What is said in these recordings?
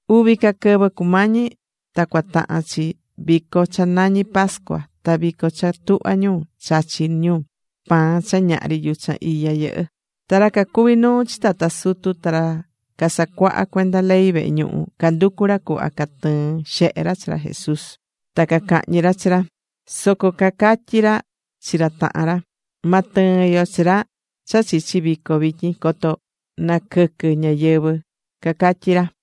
Uvi ca quɨvɨ cumañi ta cua tahan chi vico cha nañí pascua ta vico cha tuhva ñu chachí ñu pan cha ñahri yuchan iya yɨhɨ́. Ta ra cacuví nuu chi tata sutu ta ra casacuahá cuenda ley vehe ñuhu canducú ra cuhva catɨɨn xehe ra chi ra Jesús ta cacahñi ra chi ra. Soco cacatyí ra chi ra tahan ra: ―Ma tɨɨn yo chi ra cha chichi vico vityin coto naquɨquɨ ñáyɨvɨ ―cacatyí ra.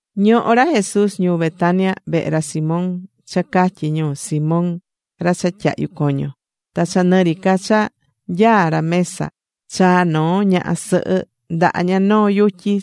Ñohó ra Jesús ñuu Betania vehe ra Simón, cha catyí ñu: “Simón ra cha tyahyu coño.” Ta cha nɨ ri ca cha nyaá ra mesa, chaa̱ noo ñaha sɨhɨ ndaha ña noo yutyi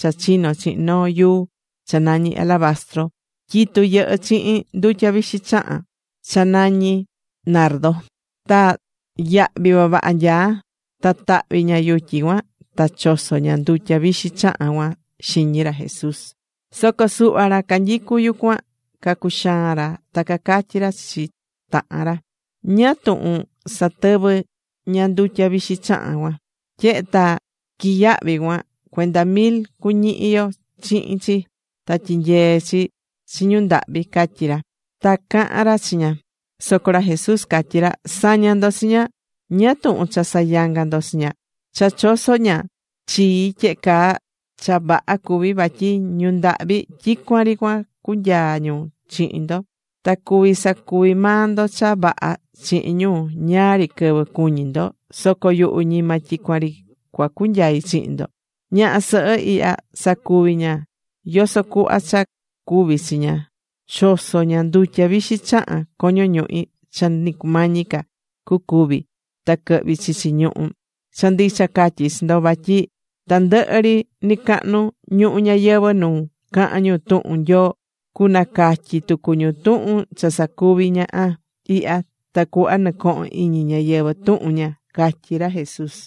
cha chino̱ chihin noo yuu cha nañí alabastro. Tyitu yɨhɨ́ chihin ndutya vixi chahán cha nañí nardo. Ta yahvi vavaha nyaá. Ta tahvi̱ ña yutyi cuan ta choso̱ ña ndutya vixi chahán cuan xiñi ra Jesús. Soco suhva ra canyicú yucuan cacuxaan ra ta cacatyí ra chi tahan ra: ―¿Ñáá tuhun satɨvɨ̱ ña ndutya vixi chahán cuan? Tyehe ta quiyahvi̱ cuan, cuenda mil cuñihi yo chihin chi, ta tyinyee chi chi ñu ndahvi ―catyí ra. Ta caha̱n ra chi ña. Soco ra Jesús catyi̱ ra: ―¡Sa̱ña ndo chi ña! ¿Ñáá tuhun cha sayangá ndo chi ña? Cha choso̱ ña chii tyehe caa, cha vaha cuví. Vatyi ñu ndahvi tyicuan ri cua cunyaa ñu chihin ndo, ta cuví sacuvi maa ndo cha vaha chihin ñu ñáá ri quɨvɨ cuñí ndo. Soco yuhu ñima tyicuan ri cua cunyai chihin ndo. Ñaha sɨhɨ ihya sacuvi̱ ña yoso cuhva cha cuvi̱ chi ña. Choso̱ ña ndutya vixi chahán coño ñuhi, cha ni cumañi ca cucúvi ta quɨhvi chichi ñuhu. Cha ndicha catyí chi ndo, vatyi tandɨhɨ ri nɨcahnu ñuhu ñayɨvɨ̱ nu cahan ñu tuhun Nyoo, cunacatyi tucu ñu tuhun cha sacuvi̱ ñaha ihya, tacuhva nɨcohon iñi ñáyɨvɨ tuhun ña ―catyí ra Jesús.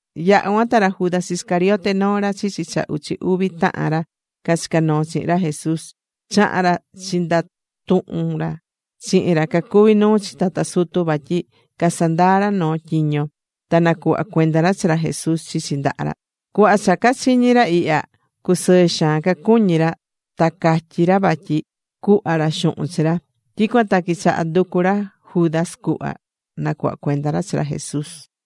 Yaha̱ cuan ta ra Judas Iscariote, noo ra chichi cha uchi uvi tahan ra cachicá noo chihin ra Jesús, chaha̱n ra chindatuhun ra chihin ra cacuví nuu chi tata sutu, vatyi casandaa ra noo tyiño ta nacuhva cuenda ra chi ra Jesús chichi ndaha ra. Cuhva cha cachiñi̱ ra ihya, cusɨɨ xaan cacuñí ra, ta catyí ra vatyi cuhva ra xuhun chi ra. Tyicuan ta quichaha̱ nducu ra Judas cuhva nacuhva cuenda ra chi ra Jesús.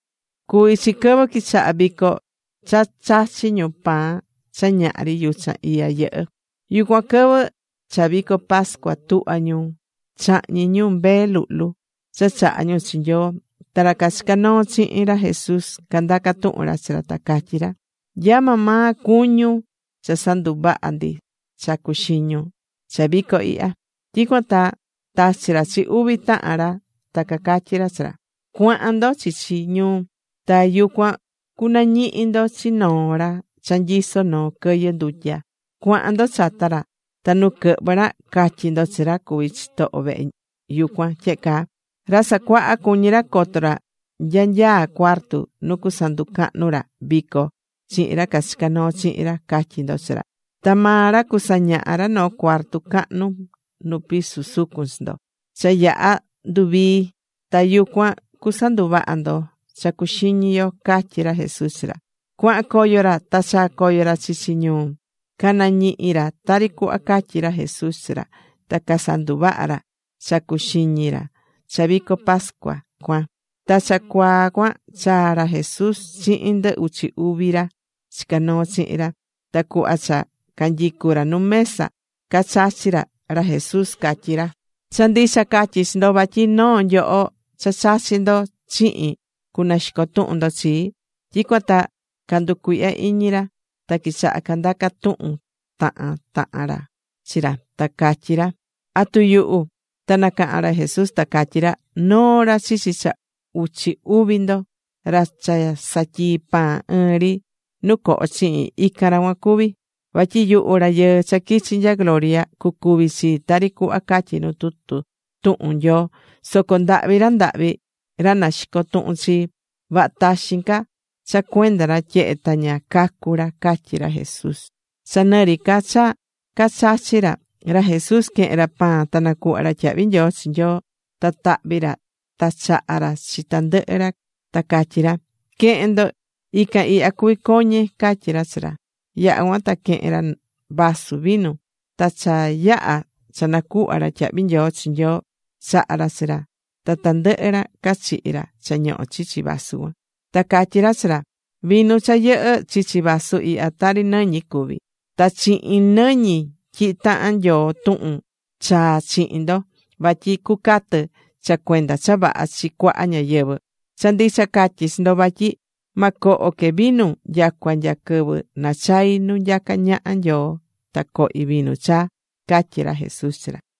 Cuví chi quɨvɨ quichaha vico cha chachí ñu pan cha ñahri yuchan iya yɨhɨ́. Yucuan quɨvɨ cha vico pascua tuhvá ñu chahñi ñu mbee luhlu cha chahá ñu chi Nyoo. Ta ra cachicá noo chihin ra Jesús candaca̱ tuhun ra chi ra, ta cacatyí ra: ―¿Nya maa maa cuñún cha sanduvaha ndi cha cuxiñun cha vico ihya? Tyicuan ta tachi̱ ra chi uvi tahan ra ta catyí ra chi ra: ―Cua̱han ndo chichi ñuu, ta yucuan cunañihi ndo chi noo ra cha nyisó noo quɨyɨ ndutya. Cua̱han ndo chata ra. Ta nu quɨhvɨ ra, ca̱tyi ndo chi ra cuví chitoho vehe yucuan tyehe caa: “Ra Sacuaha cuñí ra coto ra nya nyaá cuartu nu cusanducahnu ra vico chihin ra cachicá noo chihin ra”, ca̱tyi ndo chi ra. Ta maa ra cusañaha ra noo cuarto cahnu nu piso sucun chi ndo. Cha yaha̱ nduvii, ta yucuan cusanduvaha ndo cha cuxiñi yo ―catyí ra Jesús chi ra. Cuahan coyo ra. Ta chaa̱ coyo ra chichi ñuu. Canañihi̱ ra tari cuhva catyi̱ ra Jesús chi ra, ta casanduvaha̱ ra cha cuxiñi ra cha vico pascua cuan. Ta cha cuaa cuan chaa̱ ra Jesús chihin ndɨ uchi uvi ra chicá noo chihin ra. Ta cuhva cha canyicú ra nu mesa cachachí ra, ra Jesús catyí ra: ―Cha ndicha catyí chi ndo vatyi noo nyoho cha chachí ndo chihin cunaxico tuhun ndo chii. Tyicuan ta canducuihya̱ iñi ra ta quichaha candaca̱ tuhun tahan tahan ri ra chi ra, ta cacatyí ra: ―¿Atu yuhu? Ta nacaha̱n ra Jesús ta catyí ra: ―Noo ra chichi cha uchi uvi ndo. Ra cha satyii pan ɨɨn ri nu coho chihin, ican ra cuan cuví. Vatyi yuhu Rayɨɨ cha quichi̱ nya gloria cucuvi chii tari cuhva catyí nu tutu tuhun Nyoo. Soco ¡ndahvi ra ndahvi ra naxicó tuhun chii! Vaha taxin ca cha cuenda ra, tyehe ta ña cacu̱ ra ―catyí ra Jesús. Cha nɨ ri ca cha cachachí ra, ra Jesús quehen ra pan ta nacuhva̱ ra tyahvi nyoo chi Nyoo. Ta tahvi̱ ra ta chaha̱ ra chi tandɨhɨ ca ra, ta catyí ra: ―Que̱hen ndo. Ican ihya cuví coñe ―catyí ra chi ra. Yaha̱ cuan ta quehe̱n ra vaso vinu. Ta cha yaha̱ cha nacuhva̱ ra tyahvi nyoo chi Nyoo, chaha̱ ra chi ra. Ta tandɨhɨ ra cachihi̱ ra cha ñohó chichi vaso cuan. Ta catyí ra chi ra: ―Vinu cha yɨhɨ́ chichi vasu ihya tari nɨñi cuví. Ta chihin nɨñi tyihí tahan Nyoo tuhun chaa chihin ndo vatyi cucatɨ cha cuenda cha vaha chi cuaha ñáyɨvɨ. Cha ndicha catyí chi ndo vatyi ma coho que vinu nyacua nya quɨvɨ nachai nu nyacá ñaha Nyoo ta cohi vinu chaa ―catyí ra Jesús chi ra.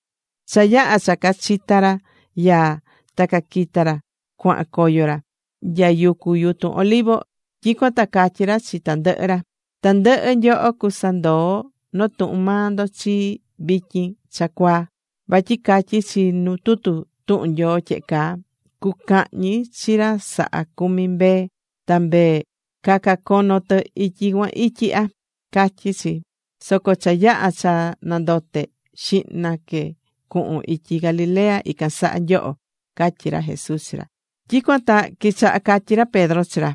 Cha yaha̱ cha cachita̱ ra yaa, ta caquita̱ ra cuahan coyo ra nya yucu yutun Olivo. Tyicuan ta catyí ra chi tandɨhɨ ra: ―Tandɨhɨ nyoho cusandoo notuhun maa ndo chii vityin cha cuaa. Vatyi catyí chi nu tutu tuhun Nyoo tyehe caa: “Cucahñi chi ra sahá cumi mbee, ta mbee cacacono tɨ ityi cuan ityi ihya”, catyí chi. Soco cha yaha cha nandote, xihna que cuhun ityi Galilea ican saha nyoho ―catyí ra Jesús chi ra. Tyicuan ta quichaha catyí ra Pedro chi ra: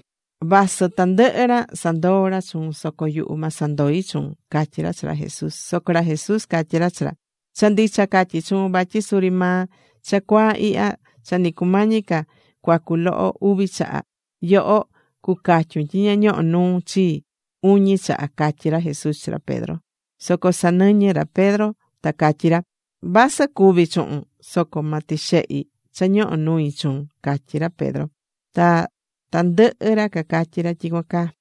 ―Vasɨ tandɨhɨ ra sandoo ra chuun, soco yuhu ma sandoi chuun ―catyí ra chi ra Jesús. Soco ra Jesús catyí ra chi ra: ―Cha ndicha catyí chuun, vatyi suri maa cha cuaa ihya, cha ni cumañi ca cuacu loho uvi chaha, yoho cucatyun tyi ña ñohó nuun chii uñi chaha ―catyí ra Jesús chi ra Pedro. Soco sanɨñɨ̱ ra Pedro ta catyí ra: ―Vasɨ cúvi chuhun, soco ma tixehi cha ñohó nui chuun ―catyí ra Pedro. Ta tandɨhɨ ra cacatyí ra tyicuan caa.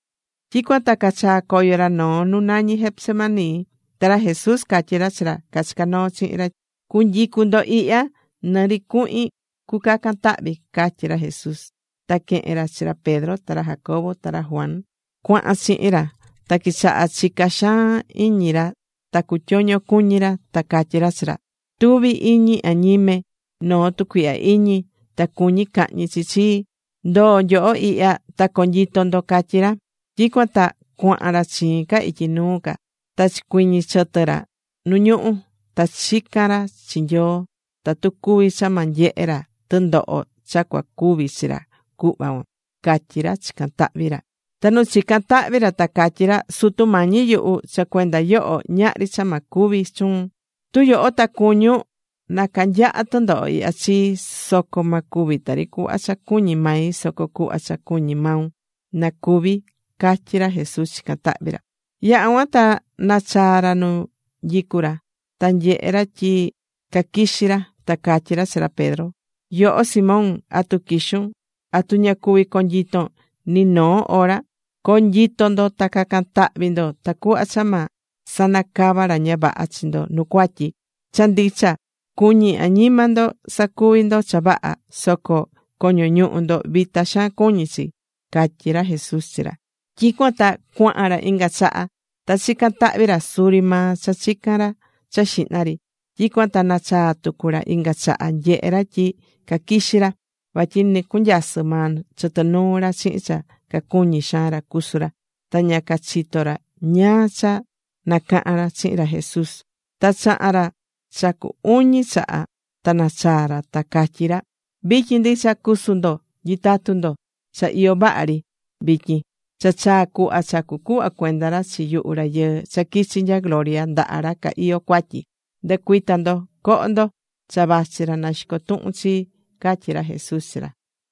Tyicuan ta cachaa̱ coyo ra noo nu nañí Getsemaní. Ta ra Jesús catyí ra chi ra cachicá noo chihin ra: ―Cu̱nyicu ndo ihya nɨ ri cuhin cucacan tahvi ―catyí ra Jesús. Ta quehe̱n ra chi ra Pedro, ta ra Jacobo ta ra Juan cuahan chihin ra. Ta quichaha̱ chica xaan iñi ra ta cutyoño cuñí ra. Ta catyí ra chi ra: ―Tuví iñi añime noo tucuihya iñi, ta cuñí cahñi chi chii. Ndo̱o nyoho ihya, ta co̱nyito ndo ―catyí ra. Tyicuan ta cuahan ra chiin ca ityi nuu ca. Ta chicuiñi̱ chɨtɨ ra nu ñuhú. Ta chica̱n ra chi Nyoo tatu cuvi cha ma nyehe ra tɨndoho cha cua cuvi chi ra cuhva cuan, catyí ra chicán tahvi ra. Ta nu chicán tahvi ra, ta catyí ra: ―Sutu Mañi yuhu, cha cuenda yoho ñahri cha ma cuvi chuun. Tu yoho ta cuñún na canyaha tɨndoho ihya chii. Soco ma cuvi tari cuhva cha cuñí mai, soco cuhva cha cuñí maun na cuvi ―catyí ra Jesús chicán tahvi ra. Yaha̱ cuan ta nachaa̱ ra nu nyicú ra. Ta nyehe̱ ra tyi caquixí ra. Ta catyí ra chi ra Pedro: ―Yoho Simón, ¿atu quixún? ¿Atu ña cuvi̱ conyiton ni noo hora? Co̱nyito ndo ta ca̱can tahvi ndo tacuhva cha ma sanacava ra ña vaha chi ndo nu cuatyi. Cha ndicha, cuñí añima ndo sacuvi ndo cha vaha, soco coño ñuhu ndo vita xaan cuñí chi ―catyí ra Jesús chi ra. Tyicuan ta cuahan ra inga chaha. Ta chica̱n tahvi ra suri maa cha chica̱n ra cha xihna ri. Tyicuan ta nachaa̱ tucu ra inga chaha, nyehe̱ ra tyi caquixí ra. Vatyi nɨcunyasɨ maa chitɨ nuu ra chihin cha cacuñí xaan ra cusu ra. Ta ña cachitó ra ñáá cha nacahan ra chihin ra Jesús. Ta chaha̱n ra cha cu uñi chaha, ta nachaa̱ ra, ta catyí ra: ―Vityin ndicha cu̱su ndo, nyi̱tatu ndo. Cha iyó vaha ri vityin, cha chaa̱ cuhva cha cucuhva cuenda ra chi yuhu Rayɨɨ cha quichi nya gloria ndaha ra ca iyó cuatyi. Ndɨ̱cuita ndo, co̱ho ndo. Cha vachi ra naxicó tuhun chii ―catyí ra Jesús chi ra.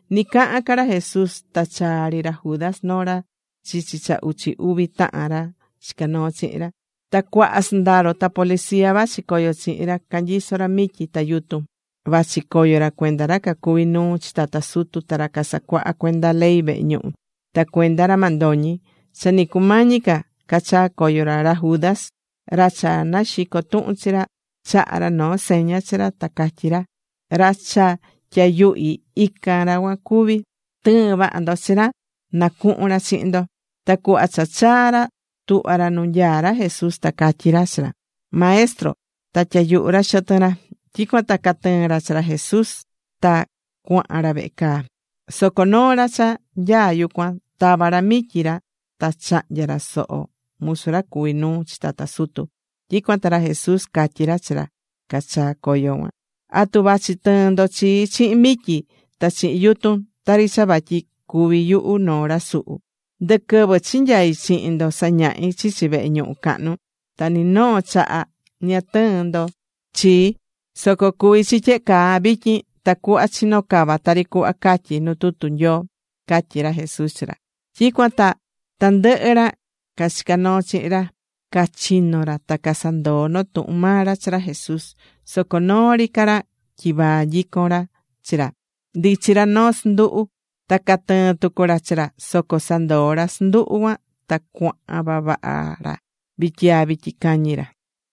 Ni cahán ca ra Jesús ta chaa̱ ri ra Judas, noo ra chichi cha uchi uvi tahan ra chicá noo chihin ra. Ta cuaha sɨndaro ta policía vachi coyo chihin ra canyisó ra mityi ta yutun. Vachi coyo ra cuenda ra cacuví nuu chi tata sutu, ta ra casacuaha cuenda ley vehe ñuhu, ta cuenda ra mandoñi. Cha ni cumañi ca cachaa coyo ra, ra Judas, ra cha naxicó tuhun chi ra, chaha̱ ra noo seña chi ra ta catyi̱ ra: ―Ra cha tyayuhi, ican ra cuan cuví. Tɨ̱ɨn vaha ndo chi ra na cuhun ra chihin ndo. Ta cuhva cha chaa̱ ra tuhva̱ ra nu nyaá ra Jesús ta catyí ra chi ra: ―Maestro. Ta tyayuhu̱ ra xɨtɨn ra. Tyicuan ta catɨɨ̱n ra chi ra Jesús ta cuahan ra vehe caa. Soco noo ra cha nyaá yucuan tava̱ ra mityi ra ta chahnya̱ ra soho musu ra cuví nuu chi tata sutu. Tyicuan ta ra Jesús catyí ra chi ra cachaa̱ coyo cuan: ―¿Atu vachi tɨɨn ndo chii chihin mityi ta chihin yutun, tari cha vatyi cuví yuhu noo ra suhu? Ndɨ quɨvɨ chinyai̱ chihin ndo sañahi̱ chichi vehe ñuhu cahnu cuan. Ta ni noo chaha ña tɨɨ̱n ndo chii. Soco cuví chi tyehe caa vityin, tacuhva chino cava tari cuhva catyí nu tutu tuhun Nyoo ―catyí ra Jesús chi ra. Tyicuan ta tandɨhɨ ra cachicá noo chihin ra, cachino̱ ra ta casandoo̱ noo tuhun maa ra chi ra Jesús. Soco noo ri ca ra tyivaa nyicón ra chi ra, ndichí ra noo sɨnduhu ta catɨɨ̱n tucu ra chi ra. Soco sandoo̱ ra sɨnduhu cuan ta cuahan vavaha ra vityiaa vityi cañi ra.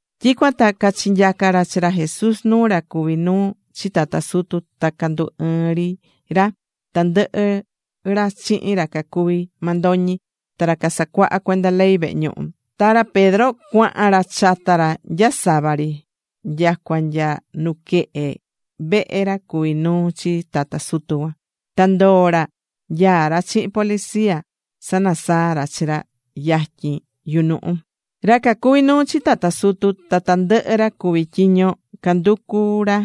Tyicuan ta cachinyaca̱ ra chi ra Jesús nuu ra cuví nuu chi tata sutu, ta candu ɨɨ̱n ri tandɨhɨ ra chihin ra cacuví mandoñi, ta ra casacuahá cuenda ley vehe ñuhu. Ta ra Pedro cuahan ra chata ra nya sava ri, nyacua nya nuquehe vehe ra cuví nuu chi tata sutu cuan. Ta ndoo̱ ra nyaá ra chihin policía sanasaá ra chi ra yatyin yunuhu. Ra cacuví nuu chi tata sutu, ta tandɨhɨ ra cuví tyiño canducu ra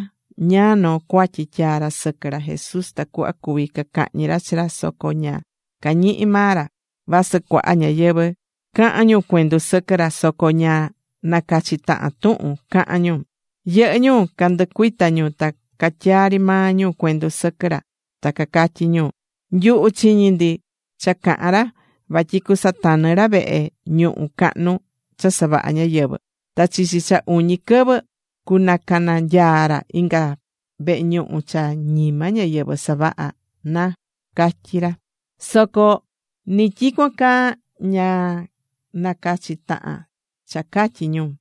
ñáá noo cuatyi tyaa ra sɨquɨ ra Jesús, tacuhva cuvi cacahñi ra chi ra soco ña cañihi̱ maa ra. Vasɨ cuaha ñáyɨvɨ caha̱n ñu cuendu sɨquɨ ra, soco ña nacachí tahan tuhun cahán ñu. Yɨhɨ́ ñu candɨcuita̱ ñu ta catyaa̱ ri maa ñu cuendu sɨquɨ ra, ta cacatyí ñu: ―Nyuhu chiñi̱ ndi cha caha̱n ra vatyi cusatanɨ ra vehe ñuhu cahnu cha savaha̱ ñáyɨvɨ. Ta chichi cha uñi quɨvɨ cunacananyaa ra inga vehe ñuhu cha ñima ñáyɨvɨ savaha, na ―catyí ñu. Soco ni tyicuan caa ña nacachi̱ tahan cha catyi̱ ñu.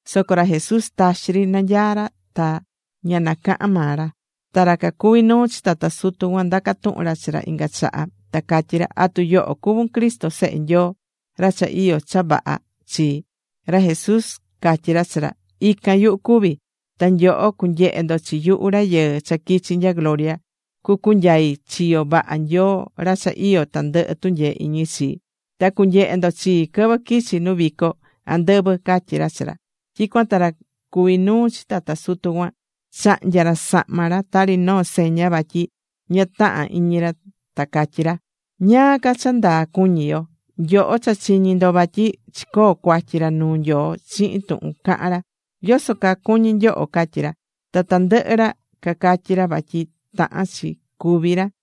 Soco ra Jesús taxi ri nanyaá ra, ta ña nacaha̱n maa ra. Ta ra cuví nuu chi tata sutu cuan ndaca̱ tuhun ra chi ra inga chaha, ta catyí ra: ―¿Atu yoho cuvún Cristo, Sehe Nyoo ra cha iyó cha vaha chi? Ra Jesús catyí ra chi ra: ―Ican, yuhu cuví. Ta nyoho cunyehe ndo chi yuhu Rayɨɨ cha quichi̱ nya gloria, cucunyai chiyo vaha Nyoo ra cha iyó tandɨhɨ tunyee iñi chi. Ta cunyehe ndo chii quɨvɨ quichi nu vico andɨvɨ ―catyí ra chi ra. Tyicuan ta ra cuví nuu chi tata sutu cuan, chahnya̱ ra sahma ra tari noo seña vatyi ña tahán iñi ra, ta catyí ra: ―¿Ñáá ca cha ndaa cuñí yo? Nyoho cha chiñi̱ ndo vatyi chicoo̱ cuatyi ra nuu Nyoo chihin tuhun cahán ra. ¿Yoso caa cuñí nyoho? ―catyí ra. Ta tandɨhɨ ra cacatyí ra vatyi tahán chi cúvi ra.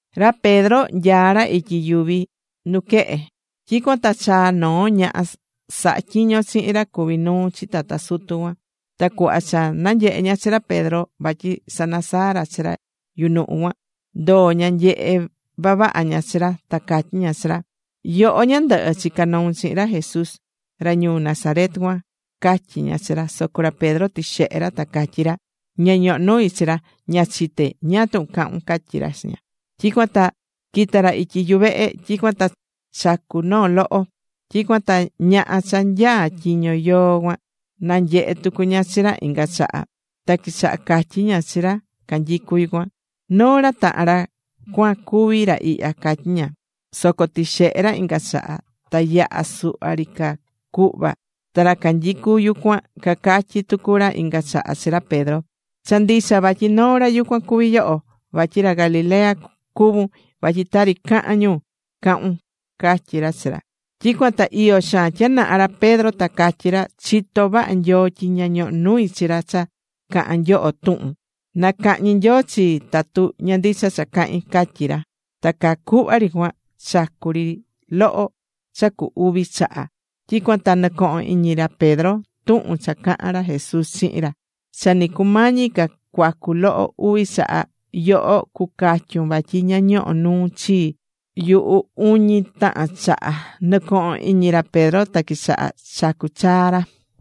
Ra Pedro nyaá ra ityi yuvi nuquehe. Tyicuan ta chaa̱ noo ñaha sahá tyiño chihin ra cuví nuu chi tata sutu cuan. Ta cuhva cha nanyehe̱ ña chi ra Pedro vatyi sanasaá ra chi ra yunuhu cuan, ndoo̱ ña nyehé vavaha ña chi ra, ta catyí ña chi ra: ―Yoho ñandɨhɨ, chica̱ noun chihin ra Jesús ra ñuu Nazaret cuan ―catyí ña chi ra. Soco ra Pedro tixehe̱ ra, ta catyí ra: ―Ña ñohó nui chi ra, ña chité ñáá tuhun cahún ―catyí ra chi ña. Tyicuan ta quita̱ ra ityi yuvehe. Tyicuan ta chacu̱ noo loho. Tyicuan ta ñaha cha nyaá tyiño yoo cuan, nanyehe̱ tucu ña chi ra inga chaha ta quichaha̱ catyi ña chi ra canyicú yucuan: ―Noo ra tahan ra cuan cuví ra ihya ―catyí ña. Soco tixehe̱ ra inga chaha. Ta yaha suhva ri ca cuhva ta ra canyicú yucuan cacatyí tucu ra inga chaha chi ra Pedro: ―Cha ndicha vatyi noo ra yucuan cuví yoho, vatyi ra Galilea cuvún, vatyi tari cahán ñu, cahún ―catyí ra chi ra. Tyicuan ta iyo xaan tyanaha ra Pedro, ta catyí ra: ―¡Chitó vaha Nyoo tyi ña ñohó nui chi ra cha cahán nyoho tuhun! ¡Na cahñi Nyoo chii tatu ña ndicha cha cahín! ―catyí ra. Ta caa cuhva ri cuan chacu̱ ri loho cha cu uvi chaha. Tyicuan ta nɨcoho̱n iñi ra Pedro tuhun cha caha̱n ra Jesús chihin ra: “Cha ni cumañi ca cuacu loho uvi chaha, yoho cucatyun vatyi ña ñohó nuun chi yuhu uñi tahan chaha.” Nɨcoho̱n iñi ra Pedro ta quichaha chacu chaa ra.